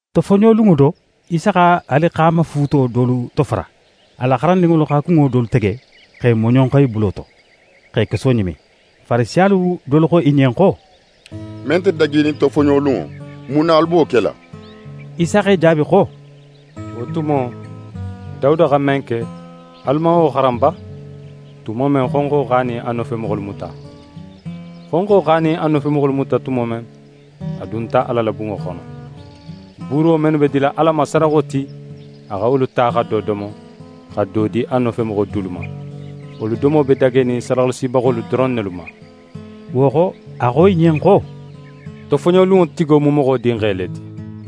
Tofoɲolunŋo do, Isa xa alixaamafuuto dolu tofara. A la xarandinŋolu xa kunŋo dolu tege x'e moɲonxo i bulo to, x'e keso ɲimi. Farisiyalu dolu xo i ɲen xo: «Men nte dagenin tofoɲolunŋo, mun na alu be wo kela?» Isa x'e jaabi xo: «Wo tumo, Dawuda xa men ke, alu man wo xaran ba, tumo men, xonxo x'a nin a nofemoxolu muta? Xonxo x'a nin a nofemoxolu muta tumo men, a dunta Ala la bunŋo xono. Buuro mennu be dila Ala ma sadaxo ti, a xa wolu ta xa do domo, xa do di a nofemoxo dulu ma. Wolu domo be dagenin sadaxalasibaxolu doron nelu ma.» Wo xo, a xo i ɲen xo: «Tofoɲolunŋo tigo mu Moxo Dinxe le ti.»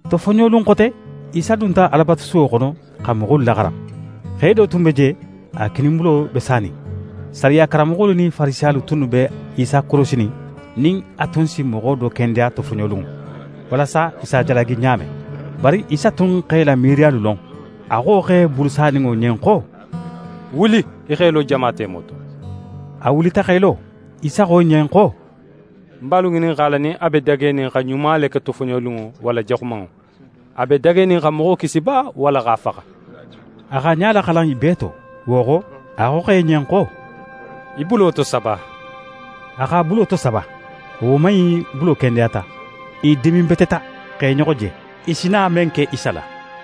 Tofoɲolun xote, Isa dunta Alabatusuwo xono xa moxolu laxaran. Xe do tun be je, a kininbulo be sanin. Sariya karanmoxolu nin Farisiyalu tunnu be Isa korosinin nin a tun si moxo do kendeya tofoɲolunŋo, walasa i s'a jalagi ɲa men. Bari Isa tun x'e la miiriyalu lon, a xo xe bulu saninŋo ɲen xo: «Wuli, í x'é lo jama temo to.» A wulita x'é lo. Isa xo i ɲen xo: «Ń be alu ŋininxala nin a be dagenin xa ɲuma le ke tofoɲolunŋo walla jaxumanŋo? A be dagenin xa moxo kisi ba walla x'a faxa?» A x'a ɲa laxalan i bee to, wo xo, a xo xe ɲen xo: «Í bulo tosaba.» A x'a bulo tosaba. A woman in bulo kendeyata. I diminbeteta, x'e ɲoxo je, i si na men ke Isa la.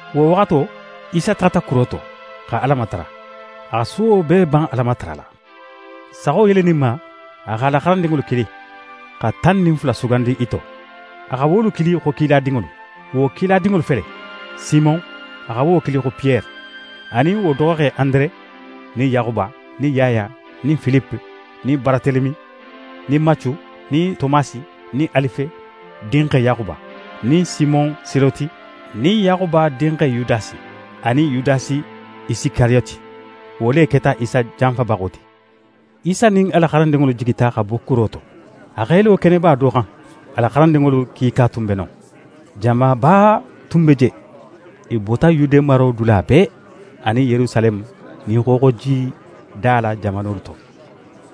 Wo waxato, Isa taxata kuro to, xa Ala matara. A xa suwo bee ban Ala matarala. Saxo yeleninma, a x'a la xarandinŋolu kili, xa tan nin fula sugandi i to. A xa wolu kili xo kiladinŋolu. Wo kiladinŋolu fele: Simon, a xa wo kili xo Piyere, anin wo doxoxe Andere nin Yaxuba, nin Yaya, nin Filipe, nin Baratelemi, nin Macu, nin Tomasi, nin Alife dinxe Yaxuba, nin Simon Seloti, nin Yaxuba dinxe Yudasi, anin Yudasi Isikariyoti. Wo le keta Isa janfabaxo ti. Isa nin a la xarandinŋolu jigita xa bo kuro to. A x'é lo keneba do xan; a la xarandinŋolu kiika tun be non. Jamaba du tun be je, i bota Yude maro dula bee, anin Yerusaleme nin xooxojida la jamanolu to,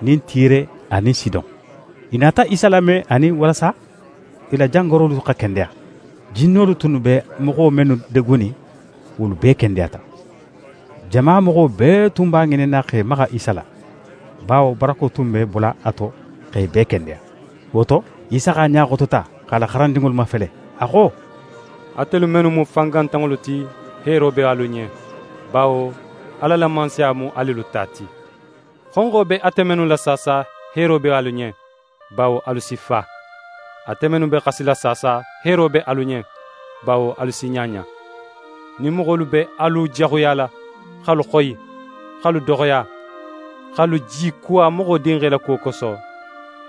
nin Tire anin Sidon. I nata Isa lame anin walasa i la jangarolu xa kendeya. Jinnolu tunnu be moxo mennu degunin, wolu bee kendeyata. Jama moxo bee tun b'a ŋininna x'e maxa Isa la, bawo barako tun be bola a to x'e bee kendeya. Wo to, Isa x'a ɲa xotota, x'a la xarandinŋolu mafele, a xo: «Atelu mennu mu fangantanŋolu ti, heero be alu ɲen, bawo Ala la Mansaya mu alelu ta ti. Xonxo be ate mennu la saasa, heero be alu ɲen, bawo alu si fa. Ate mennu be xasila saasa, heero be alu ɲen, bawo alu si ɲaɲa. «Nin moxolu be alu jaxuyala, x'alu xoyi, x'alu doxoya, x'alu jikuwa Moxo Dinxe la kuwo koso,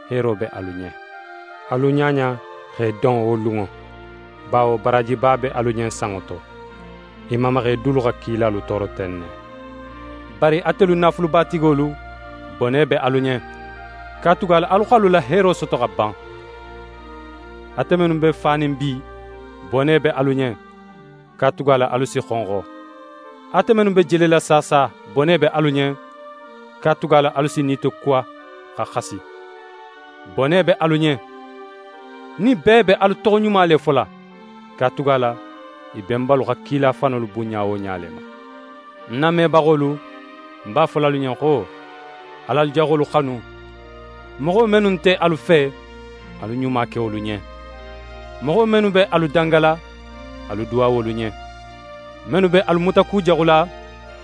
heero be alu ɲen. Alu ɲaɲa x'e don wo lunŋo, bawo baraajiba be alu ɲen sanŋo to. I mamaxe dulu xa kilalu tooro ten ne. «Bari atelu naafulubatigolu, bone be alu ɲen, katugala alu x'alu la heero soto xa ban. Ate mennu be fanin bi, bone be alu ɲen, katugala alu si xonxo. Ate mennu be jelela saasa, bone be alu ɲen, katugala alu si nitokuwa xa xasi. «Bone be alu ɲen, nin bee be alu toxoɲuma le fola, katugala i benbalu xa kila fanolu bunɲa wo ɲa le ma.» «Ń namebaxolu, ń b'a fola alu ɲen xo: Al'alu jaxolu xanu, moxo mennu nte alu fe, alu ɲuma ke wolu ɲen. Moxo mennu be alu dangala, alu duwa wolu ɲen. Mennu be alu mutakujaxula,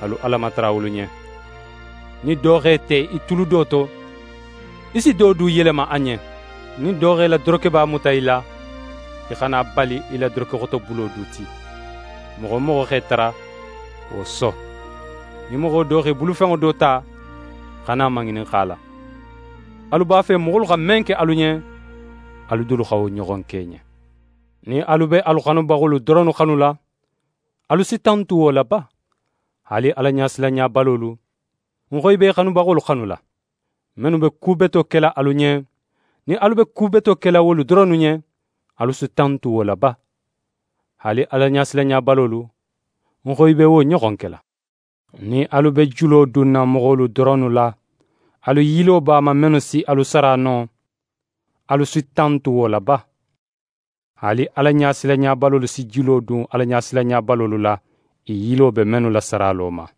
alu Ala matara wolu ɲen. Nin do x'é te í tulu do to, í si do du yelema a ɲen. Nin do x'é la dorokeba muta í la, í xana a bali í la dorokexotobulo du ti. Moxo wo moxo x'é tara, wo so. Nin moxo do x'é bulufenŋo do ta, xana a maŋininxa a la. Alu b'a fe moxolu xa men ke alu ɲen, alu dulu xa wo ɲoxon ke i ɲen. «Nin alu be alu xanubaxolu doronnu xanula, alu si tantu wo la ba? Haali Alaɲasilanɲabalolu, ń xo i b'e xanubaxolu xanula. Mennu be ku beto kela alu ɲen, nin alu be ku beto kela wolu doronnu ɲen, alu si tantu wo la ba? Haali Alaɲasilanɲabalolu, ń xo i be wo ɲoxon kela. Nin alu be julo dunna moxolu doronnu la, alu yilo b'a ma mennu si alu sara no, alu si tantu wo la ba? Haali Alaɲasilanɲabalolu si julo dun Alaɲasilanɲabalolu la, i yilo be mennu la saralo ma.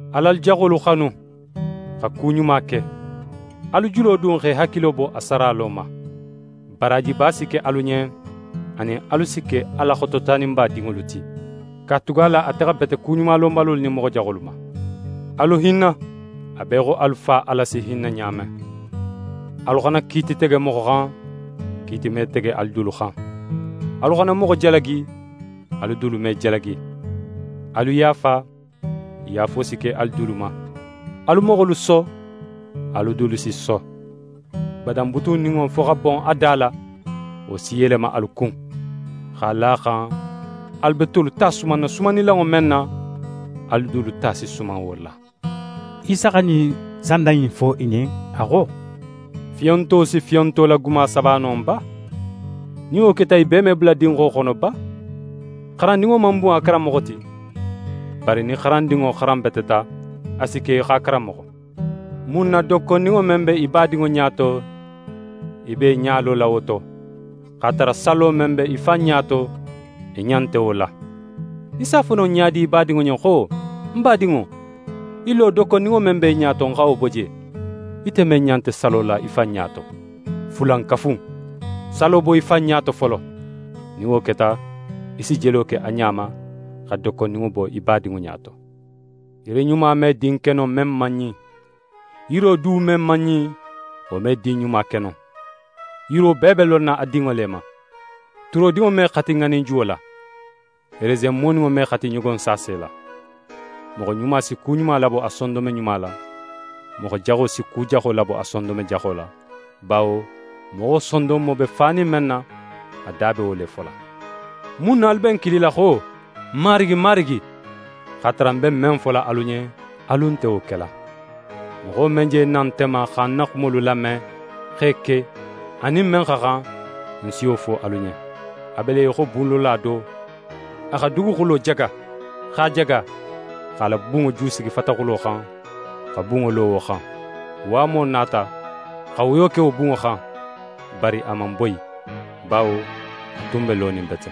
Al'alu jaxolu xanu, xa ku ɲuma ke, alu julo dun x'é hakilo bo a saralo ma. Baraajiba si ke alu ɲen, anin alu si ke Ala Xototaninba dinŋolu ti, katugala ate xa bete kuɲumalonbalolu nin moxo jaxolu ma. Alu hinna, a be í xo alu Fa Ala si hinna ɲa men.» «Alu xana kiiti tege moxo xan, kiiti me tege alu dulu xan. Alu xana moxo jalagi, alu dulu me jalagi. Alu yaafa, yaafo si ke alu dulu ma. Alu moxolu so, alu dulu si so. Badan butunninŋo, fo xa bon a da la, wo si yelema alu kun; x'a la a xan alu be tolu ta sumanna sumannilanŋo men na, alu dulu ta si suman wo la.» Isa xa ɲin sanda in du fo i ɲen, a xo: «Fiyonto si fiyonto la guma saba no ba? Nin wo keta, i bee me bula dinxo xono ba? xarandinŋo man bun a karanmoxo ti. Bari nin xarandinŋo xaranbeteta, a si ke í xo a karanmoxo. «Mun na dokkondinŋo men be í badinŋo ɲa to, í be í ɲa lola wo to, x'a tara salo men be í fan ɲa to, í ɲa nte wo la? Í s'a fo no ɲa di í badinŋo ɲen xo: “Ń badinŋo, í lo, dokkondinŋo men be í ɲa to, ń xa wo bo je,” ite men ɲa nte salo la í fan ɲa to? Fulankafu in, salo bo í fan ɲa to folo. Nin wo keta, í si jelo ke a ɲa ma, xa dokkondinŋo bo í badinŋo ɲa to.» «Yiri ɲuma me din ke no, men man ɲin. Yiro du men man ɲin, wo me din ɲuma ke no. Yiro bee be lonna a dinŋo le ma: Turodinŋo me xati ŋaninjuwo la; resen moninŋo me xati ɲogonsaase la. Moxo ɲuma si ku ɲuma labo a sondonme ɲuma la. Moxo jaxo si ku jaxo labo a sondonme jaxo la, bawo moxo sondonmo be fanin men na, a da be wo le fola.» «Mun na alu be ń kilila xo: “Marigi, Marigi”, x'a tara ń be men fola alu ɲen, alu nte wo kela? Moxo men je na nte ma, xa ń na xumolu lame, x'e ke, a nin men xa xan, ń si wo fo alu ɲen: A be le í xo bunlola do, a xa duguxulo jaga, x'a jaga, x'a la bunŋo jusigi fataxulo xan, xa bunŋo lo wo xan. Waamo nata, xa woyo ke wo bunŋo xan, bari a man boyi, bawo a tun be lonin bete.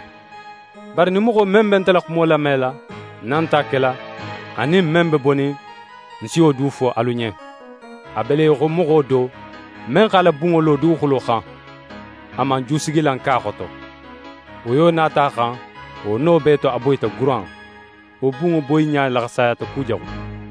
Bari nin moxo men be nte la xumo lamela, nin a nt'a kela, a nin men be bonin, ń si wo du fo alu ɲen: A be le í xo moxo do, men x'a la bunŋo lo duguxulo xan. A man jusigilan ke a xoto. Woyo nata a xan, wo no bee to, a boyita guran. Wo bunŋo boyiɲa laxasayata kujaxu.»